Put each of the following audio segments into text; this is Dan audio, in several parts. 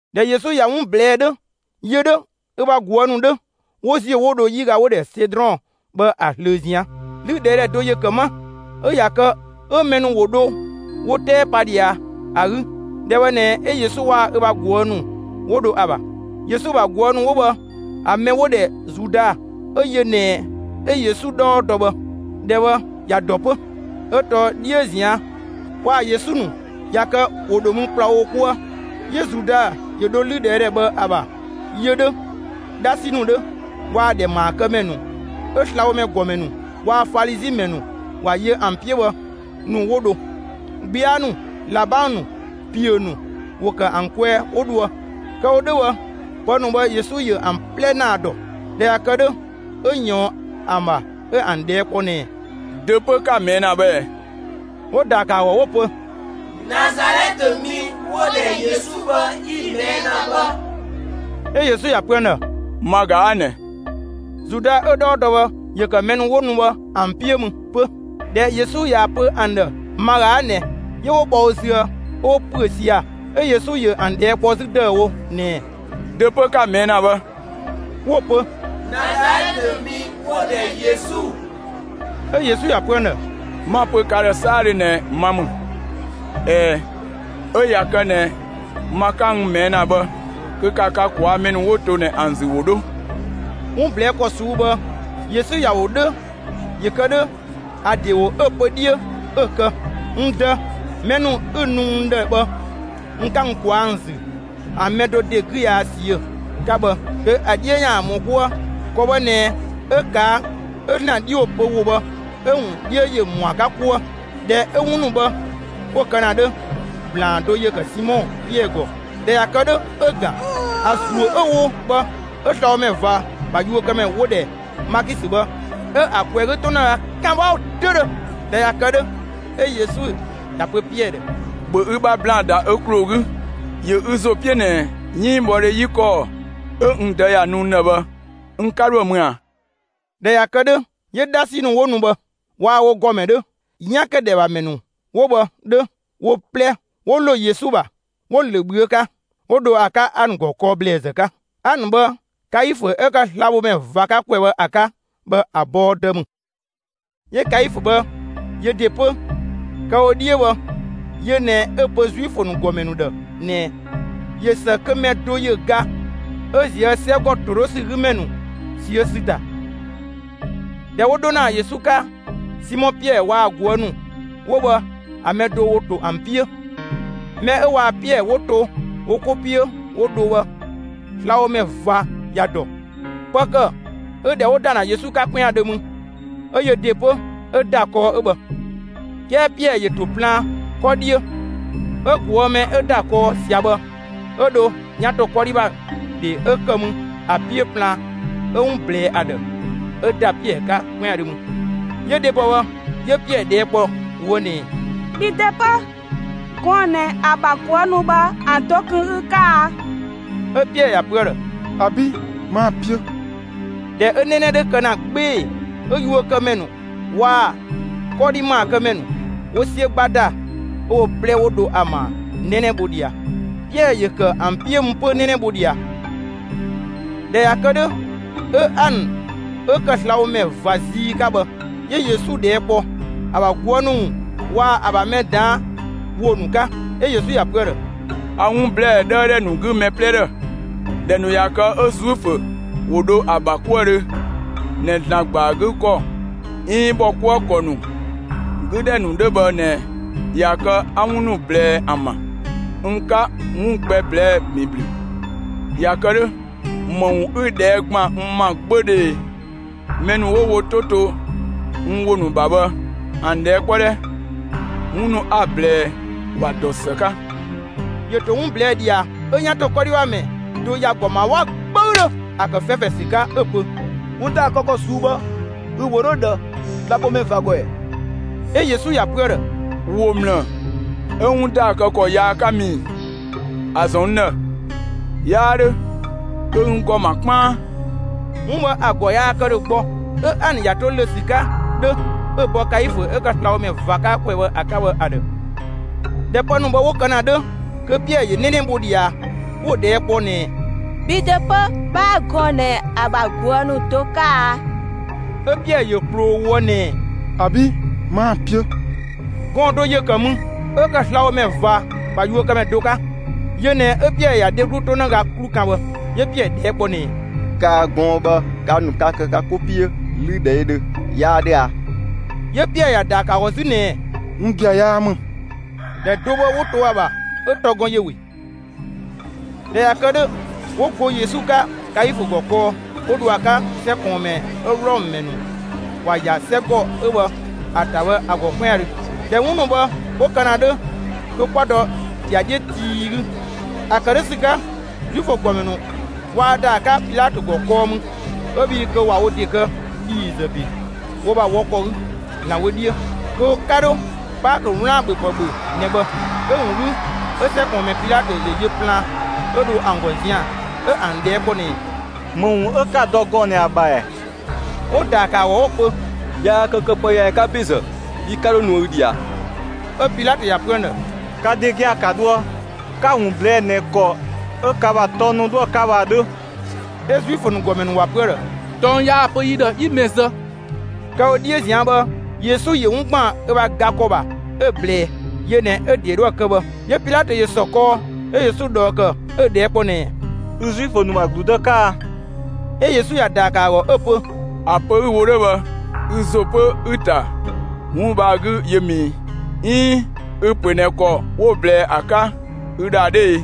꞊Dhɛ Yesu ꞊ya 'wun ꞊blɛɛ'‑ 'dhö, yö 'dhö, ö ‑bha ꞊guë' ‑nu 'dhö, ‑wo ‑ziö 'wo dho 'yiga 'wo‑ ‑dhɛ Sedrɔn bhë ‑a ꞊zlöö ꞊zian'. 'Lüdhɛɛdhɛ do ‑yö ‑kë 'ma ('ö ꞊ya kë 'ö mɛ ‑nu ‑wo dho wo 'tɛɛ pa ꞊dhia ‑a 'gü). ‑Dhɛ bhë ꞊nɛ 'ö Yesu waa‑ ö ‑bha ꞊guë' ‑nu 'wo dho ‑a ‑bha. Yesu ‑bha ꞊guë' ‑nu 'wo bhë ‑a mɛ 'wo‑ ‑dhɛ Zuda, 'ö yö ꞊nɛ 'ö Yesu 'dhɔɔ dɔ bhë, ‑dhɛ bhë ‑ya ‑dɔ 'pö, 'ö tɔɔ 'dhiö ꞊zian', waa‑ Yesu ‑nu ꞊ya kë ‑wo ‑dho mü ‑kplawo wo 'kuë. 'Yö Zuda ‑yö dho 'lüdhɛɛdhɛ bhë ‑a ‑bha, yö 'dhö, 'dhasi ‑nu 'dhö, waa‑ ‑dhɛ ‑maakëmɛ ‑nu 'ö slabhomɛ ‑gɔmɛ ‑nu waa‑ Falizi ‑mɛ ‑nu ‑wa yö ‑an 'piö bhë ‑nu, 'wo dho. 'Gbia ‑nu, ꞊labang ‑nu, ‑piö ‑nu, ‑wo ‑kë ‑an kwɛɛ 'wo dhoë. Kë‑ wo 'dhö bhë, pë ‑nu bhë Yesu ‑yö ‑an 'plɛ ‑naa ‑dɔ. ꞊Dhɛ ꞊ya kë 'dhö, 'ö ꞊yɔɔn ‑an ‑bha, 'ö ‑an ꞊dhɛɛ' kpɔ ꞊nɛɛ: «Dö 'pö 'ka‑ ꞊mɛɛ' ‑na bhë ꞊ɛ?» 'Wo‑ ‑da ‑kë ‑a ‑gɔ, 'wo‑ pö: «Nazalɛtë mi 'wo‑ ‑dhɛ Yesu bhë 'yi‑ ꞊mɛɛ' ‑na bhë.» 'Ö Yesu ‑ya pö ‑an ‑dhë: «Ma ꞊ga 'a ꞊nɛ!» Zuda 'ö‑ 'dhɔɔ dɔ bhë, ‑yö ‑kë mɛ 'wo nu bhë ‑an 'piö mü 'pö. ꞊Dhɛ Yesu ‑ya pö ‑an ‑dhë «ma ꞊ga 'a ꞊nɛ,» 'yö 'wo bhɔ wo züë 'ö 'wo ‑püö sia‑. 'Ö Yesu ‑yö ‑an ꞊dhɛɛ' kpɔ 'zü ‑dëüwo ꞊nɛɛ: «Dö 'pö 'ka‑ ꞊mɛɛ' ‑na bhë?» 'Wo‑ pö: «Nazalɛtë mi 'wo‑ ‑dhɛ Yesu.» 'Ö Yesu ‑ya pö ‑an ‑dhë: «'Ma‑ pö ka ‑dhë 'saadhö ꞊nɛ ma ‑mü. ꞊Ɛɛ, 'ö ꞊ya kë ꞊nɛ ma 'ka n ꞊mɛɛ' ‑na bhë kö ‑ka ka ꞊kwaa'‑ mɛ ‑nu 'wo to ꞊nɛ ‑an ‑zü ‑wo 'dho.» 'Wun ꞊blɛɛ' ‑kɔ ꞊suu'‑ bhë, Yesu ‑ya ‑wo 'dhö ‑yö kë 'dhö ‑a ‑de ‑wo 'ö‑ pö 'dhiö 'ö ‑kë: «N Dë, mɛ ‑nu 'ü‑ nu n ‑dhë bhë, n 'ka n ꞊kwaa'‑ ‑an ‑zü ‑an mɛ do ‑de 'gü yaa ꞊siö'‑» 'ka bhë, kö ‑a 'dhiö ‑yaan ‑mɔ 'kuë. ‑Kɔ bhë ꞊nɛ 'ö ꞊kaa', 'ö ‑Zlan 'dhi ‑wo pö ‑wo bhë 'ö‑ ‑wun 'dhiö ‑yö ‑mɔ ‑a 'ka 'kuë. ꞊Dhɛ 'ö 'wun ‑nu bhë 'wo kë ‑na 'dhö, ‑blaan do ‑yö ‑kë Simɔ Piɛɛ ‑gɔ. ꞊Dhɛ ꞊ya kë 'dhö, 'ö‑ ‑gan; ‑a ‑zuö 'ö‑ wo bhë 'ö slabhomɛ ꞊va ‑bha yuökëmɛ 'wo‑ ‑dhɛ Maakisö bhë 'ö ‑a ꞊kwɛɛ‑ 'gü 'tonëga 'kan 'wa 'dödhö. ꞊Dhɛ ꞊ya kë 'dhö, 'ö Yesu ‑ya pö Piɛɛ ‑dhë: «‑Bhö ü ‑bha ‑blaan ‑da ö ‑kloo 'gü. ‑Yö ü ‑zo 'piö ꞊nɛ 'yënngbhɔdhe 'yi ‑kɔɔ 'ö n Dë ‑ya nu n ‑dhë bhë n 'ka 'dhoë‑ mü ꞊a?» ꞊Dhɛ ꞊ya kë 'dhö, 'yö 'dhasi ‑nu 'wo nu bhë waa‑ wo ‑gɔmɛ 'dhö, 'yan ‑kë ‑dhɛ ‑bha ‑mɛ ‑nu 'wo bhë 'dhö, wo 'plɛ 'wo ‑lo Yesu ‑bha, 'wo‑ ‑lö ꞊bhüö' 'ka. 'Wo dho ‑a 'ka Anë ‑gɔ kɔɔ ‑blɛɛzë 'ka. Anë bhë, Kaifö 'ö ‑kë slabhomɛ ꞊va 'ka ‑kwɛ bhë ‑a 'ka bhë ‑a bɔɔ dë ‑mü. 'Yö Kaifö bhë, yö ‑de 'pö, kë‑ wo 'dhiö bhë, yö ꞊nɛ 'ö‑ pö Zuifö ‑nu ‑gɔmɛ ‑nu ‑dhë ꞊nɛɛ: «꞊Yö ‑së kö mɛ do ‑yö ga 'ö ꞊zië' 'sɛgɔ ‑todhösü 'gü ‑mɛ ‑nu ꞊siö' ‑sü ‑ta.» ꞊Dhɛ 'wo 'dho ‑na Yesu 'ka, Simɔ Piɛɛ waa‑ ꞊guë' ‑nu 'wo bhë ‑a mɛ do ‑wo ‑to ‑an 'piö. Mɛ 'ö waa‑ Piɛɛ 'wo to wo 'ko 'piö 'wo dho bhë, slabhomɛ ꞊va ‑ya ‑dɔ. Pë ‑kë 'ö ‑dhɛ 'wo ‑da ‑na Yesu 'ka 'kwɛandhö mü, 'ö yö ‑de 'pö 'ö ‑da kɔɔ 'ö bhë. 'Kɛɛ Piɛɛ ‑yö ‑to plaan 'kɔ 'dhiö; 'ö ꞊guë' mɛ 'ö ‑da kɔɔ ꞊sia bhë, 'ö dho 'yan ‑to 'kɔdhi ‑bha ‑dhe 'ö ‑kë mü ‑a 'piö plaan, 'ö 'wun ꞊blɛɛ ‑a ‑dhë, 'ö ‑da Piɛɛ 'ka 'kwɛandhö mü. 'Yö dhebɔ bhë 'yö Piɛɛ ꞊dhɛɛ' kpɔ ꞊woë' ꞊nɛɛ: «Bhi ‑de 'pö, gɔɔn‑ ꞊nɛ ‑a ‑bha ꞊guë' ‑nu bhë ‑an do kun ü 'ka a?» 'Ö Piɛɛ ‑ya pö ‑a ‑dhë: «‑Abi', 'maa‑ 'piö.» ꞊Dhɛ 'ö 'nɛnɛ 'dhö kë ‑na 'gbee‑, 'ö yuökëmɛ ‑nu waa‑ 'kɔdhi ‑maakëmɛ ‑nu ‑wo 'siö 'gba ‑da 'ö wo 'plɛ 'wo dho ‑a ‑maa 'nɛnɛ bho ꞊dhia. Piɛɛ ‑yö ‑kë ‑an 'piö mü 'pö 'nɛnɛ bho ꞊dhia. ꞊Dhɛ ꞊ya kë 'dhö, 'ö Anë 'ö ‑kë slabhomɛ ꞊va zii 'ka bhë, 'yö Yesu ꞊dhɛɛ' kpɔ ‑a ‑bha ꞊guë' ‑nu ‑wun waa‑ ‑a ‑bha mɛ ꞊daan' ‑wo ‑nu 'ka. 'Ö Yesu ‑ya pö ‑a ‑dhë: «A 'wun ‑blɛɛ 'dhëëdhɛ ‑nu 'gü mɛ 'plɛ ‑dhë; ‑dhɛ ‑nu ꞊ya kë 'ö Zuifö ‑wo dho ‑a ‑bha 'kuëdhö ꞊nɛ ‑Zlan ‑gba ‑a 'gü ‑kɔ 'iin ‑bhɔkuëkɔ ‑nu 'gü ‑dhɛ ‑nu 'dhö bhë ꞊nɛ ꞊ya kë 'a 'wun ‑nu ꞊blɛɛ ‑an ‑bha. N 'ka 'wun gbɛ ꞊blɛɛ'‑ ‑bin ‑blü. ꞊Ya kë 'dhö, ‑më ‑wun ü‑ ꞊dhɛɛ' ‑gban n ‑ma 'gbödhö ꞊ee? Mɛ ‑nu 'wo wo 'to to n ‑wo ‑nu ‑bha bhë ‑an ꞊dhɛɛ' 'kpɔ 'dhɛ! 'Wun ‑nu 'a‑ ꞊blɛɛ, ‑wa ‑dɔ ‑së 'ka.» ‑Yö ‑to 'wun ꞊blɛɛ' ꞊dhia 'ö 'yan ‑to 'kɔdhi ‑bha ‑mɛ do ‑ya ‑gɔ ‑ma 'wa 'gböüdhö, ‑a ‑kë 'fɛfɛ ‑sü 'ka, 'ö‑ pö: «'Wun ‑daa kë ‑kɔ ꞊suu'‑ bhë ü‑ ‑wo 'dhö ꞊dhë slabhomɛ ꞊va ‑gɔ ꞊ɛɛ?» 'Ö Yesu ‑ya pö ‑a ‑dhë: «‑Wo ‑mlë 'ö 'wun ‑daa kë ‑kɔ yaa 'ka mü ii? ‑A ‑zɔn n ‑dhë, 'yaa 'dhö kö ü n ‑gɔ ‑ma 'kpaan?» 'Wun bhë ‑a ‑gɔ yaa kë ‑dhö gbɔ, 'ö Anë ‑ya to ‑lö ‑sü 'ka 'dhö 'ö‑ bɔ Kaifö 'ö ‑kë slabhomɛ ꞊va 'ka ‑kwɛ bhë ‑a 'ka bhë ‑a ‑dhë. ꞊Dhɛ pë ‑nu bhë 'wo kë ‑na 'dhö, kö Piɛɛ ‑yö 'nɛnɛ bho ꞊dhia. 'Wo‑ ꞊dhɛɛ' kpɔ ꞊nɛɛ: «Bhi ‑de 'pö 'bhaa gɔɔn‑ ꞊nɛ ‑a ‑bha ꞊guë' ‑nu do 'ka a?» 'Ö Piɛɛ ‑yö ꞊kploo ꞊woë' ꞊nɛɛ: «‑Abi', 'maa‑ 'piö.» Gɔɔn‑ do ‑yö ‑kë mü, 'ö ‑kë slabhomɛ ꞊va ‑bha yuökëmɛ do 'ka. Yö ꞊nɛ 'ö Piɛɛ ‑ya dheglu 'tonëga 'klu ‑kan bhë. 'Yö Piɛɛ ꞊dhɛɛ' kpɔ ꞊nɛɛ: «Kaa‑ gɔɔn‑ bhë ka ‑nu kaa kë ka 'ko 'piö 'lüdhɛɛdhö; 'yaa 'dhö a?» 'Yö Piɛɛ ‑ya ‑daa ‑kë ‑a ‑gɔ 'zü ꞊nɛɛ: «'Wun gia‑ 'yaa ‑mü.» ‑Dhɛ do bhë 'wo to ‑a ‑bha 'ö ‑tɔ gɔn ‑yö ‑we. ꞊Dhɛ ꞊ya kë 'dhö, 'wo go Yesu 'ka Kaifö ‑gɔ kɔɔ, 'wo dho ‑a 'ka 'sɛ ꞊kɔɔnmɛ 'ö Wlɔmë ‑mɛ ‑nu ‑wa ‑ya 'sɛgɔ 'ö bhë ‑a ‑ta bhë ‑a ‑gɔ 'kwɛandhö. ꞊Dhɛ 'wun ‑nu bhë 'wo kë ‑na 'dhö, kö 'kwa dɔ ‑dhiadhiö tii 'gü. ‑A ‑kë 'dhö ‑sü 'ka, Zuifö ‑gɔmɛ ‑nu waa ‑da ‑a 'ka Pilatö ‑gɔ kɔɔ mü 'ö bhii kö ꞊wa wo ‑de kë ‑dhiizë ‑be wo ‑bha wɔ ‑kɔ 'gü ‑Zlan wö 'dhiö; kö wo 'ka 'dho Paakö 'wlaan‑ ‑bhöpë ‑bhö ꞊nɛ bhë. 'Ö‑ ‑wun 'gü, 'ö 'sɛ ꞊kɔɔnmɛ Pilatö ‑yö yö plaan, 'ö dho ‑an ‑gɔ zian‑, 'ö ‑an ꞊dhɛɛ' kpɔ ꞊nɛɛ: «‑Më ‑wun 'ö 'ka‑ dɔ gɔɔn‑ ꞊nɛ ‑a ‑bha ‑ɛ?» 'Wo‑ ‑daa ‑kë ‑a ‑gɔ 'wo‑ pö: «Yaa kë këpëyaamɛ 'ka ‑bezë, yi 'ka 'dho nuë ü ꞊dhia.» 'Ö Pilatö ‑ya pö ‑an ‑dhë: «Ka ‑de gia‑ ka dhoë, 'ka‑ ‑wun ꞊blɛɛ'‑ ꞊nɛ ‑kɔ 'ö ka ‑bha tɔng ‑nu 'dhoë‑ 'ka bhë ‑a 'dhö.» 'Ö Zuifö ‑nu ‑gɔmɛ ‑nu ‑wa pö ‑a ‑dhë: «Tɔng yaa‑ pö yi ‑dhë 'yi mɛ zë.» Kë‑ wo 'dhiö ꞊zian' bhë, Yesu ‑yö 'wun ‑gban ö ‑bha ga ‑kɔ ‑bha 'ö‑ ꞊blɛɛ; yö ꞊nɛ 'ö ‑de 'dhoë‑ kë bhë. 'Yö Pilatö ‑yö ‑sɔ kɔɔ, 'ö Yesu ꞊dhɔɔ ‑kë, 'ö‑ ꞊dhɛɛ' kpɔ ꞊nɛɛ: «Ü Zuifö ‑nu ‑bha ‑gludë 'ka a?» 'Ö Yesu ‑ya ‑daa ‑kë 'ö‑ pö: «‑A pö 'ü‑ wo 'dhö bhë ü ‑zo 'pö 'ü‑ ‑ta 'wun bhë ‑a 'gü yö ‑mü 'iin ü‑ ‑pö ꞊nɛ ‑kɔ 'wo‑ ꞊blɛɛ ‑a 'ka ü ‑dhë ‑a 'dhö ee?»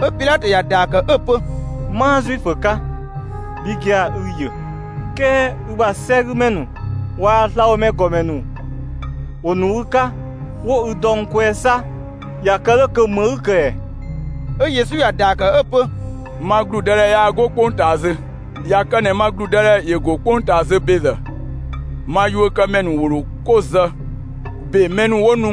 'Ö Pilatö ‑ya ‑daa ‑kë 'ö‑ pö: «'Maa Zuifö 'ka; bhi gia‑ ü‑ ‑yö; 'kɛɛ ü ‑sɛgümɛ ‑nu waa‑ slabhomɛ ‑gɔmɛ ‑nu ‑wo nu ü 'ka 'wo ü dɔ n kwɛɛ 'sa; ꞊ya kë 'dhö kö ‑më 'ü‑ ‑kë ‑ɛɛ?» 'Ö Yesu ‑ya ‑daa ‑kë 'ö‑ pö: «Ma ‑gludëdhɛ yaa 'go 'kpongtaa zö. ꞊Ya kë ꞊nɛ ma ‑gludëdhɛ ‑yö ‑go 'kpongtaa zö ‑bezë, ma yuökëmɛ ‑nu ‑wo ‑dho 'ko ‑zë ‑be mɛ ‑nu 'wo nu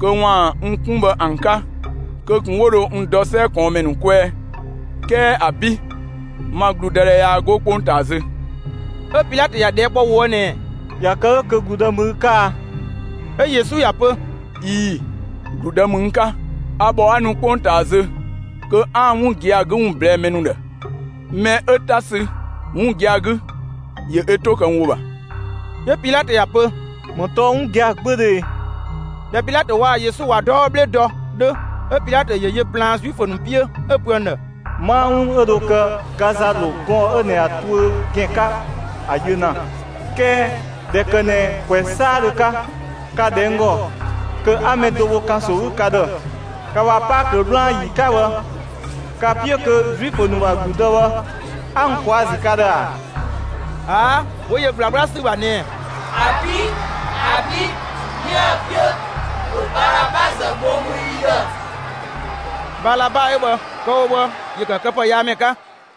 kö ‑waan n 'kun bhë ‑an 'ka, kö ꞊kun 'wo dho n dɔ 'sɛ ꞊kɔɔnmɛ ‑nu kwɛɛ. 'Kɛɛ ‑abi', ma ‑gludëdhɛ yaa 'go 'kpongtaa zö.» 'Ö Pilatö ‑ya ꞊dhɛɛ' kpɔ ꞊woë' ꞊nɛɛ: «꞊Ya kë 'dhö kö ‑gludë ‑mü ü 'ka a?» 'Ö Yesu ‑ya pö: «꞊Ii‑, ‑gludë ‑mü n 'ka. A ‑bhɔ 'a nu 'kpongtaa zö kö 'aan‑ 'wun gia‑ 'gü ‑wun ꞊blɛɛ'‑ mɛ ‑nu ‑dhë. Mɛ 'ö 'ta sü 'wun gia‑ 'gü, ‑yö ö 'to ‑kë n ‑wo ‑bha.» 'Yö Pilatö ‑ya pö: «‑Më tɔɔ 'wun gia‑ 'gbödhö ꞊e?» ꞊Dhɛ Pilatö waa‑ Yesu ꞊wa 'dɔɔ 'bhle dɔ 'dhö, 'ö Pilatö ‑yö yö plaan Zuifö ‑nu 'piö, 'ö‑ pö ‑an ‑dhë: «'Maa 'wun 'ö dho kë ga ‑za ‑lo gɔɔn‑ 'ö ꞊nɛ ‑a tuö ‑gɛn 'ka ‑a yö ‑na. 'Kɛɛ ꞊dhɛ ‑kë ꞊nɛ ‑kwɛ 'saadhö 'ka, ka‑ ‑dhɛ n ‑gɔ kö 'a mɛ do bho ‑kanso 'gü ka ‑dhë ka ‑bha Paakö 'wlaan‑ ‑yi 'ka bhë, ka‑ 'piö kö Zuifö ‑nu ‑bha ‑gludë bhë 'a n ꞊kwaa' ‑a ‑zü ka ‑dhë ‑a?» ꞊Aa', 'wo yö ꞊gblaa 'gbla ‑sü ‑bha ꞊nɛɛ: «‑Abi', ‑abi', 'yiëë‑ 'piö! ‑Bhö Balaba ‑zë bho mü yi ‑dhë!» Balaba 'ö bhë, kë‑ wo bhë, ‑yö ‑kë këpëyaamɛ 'ka.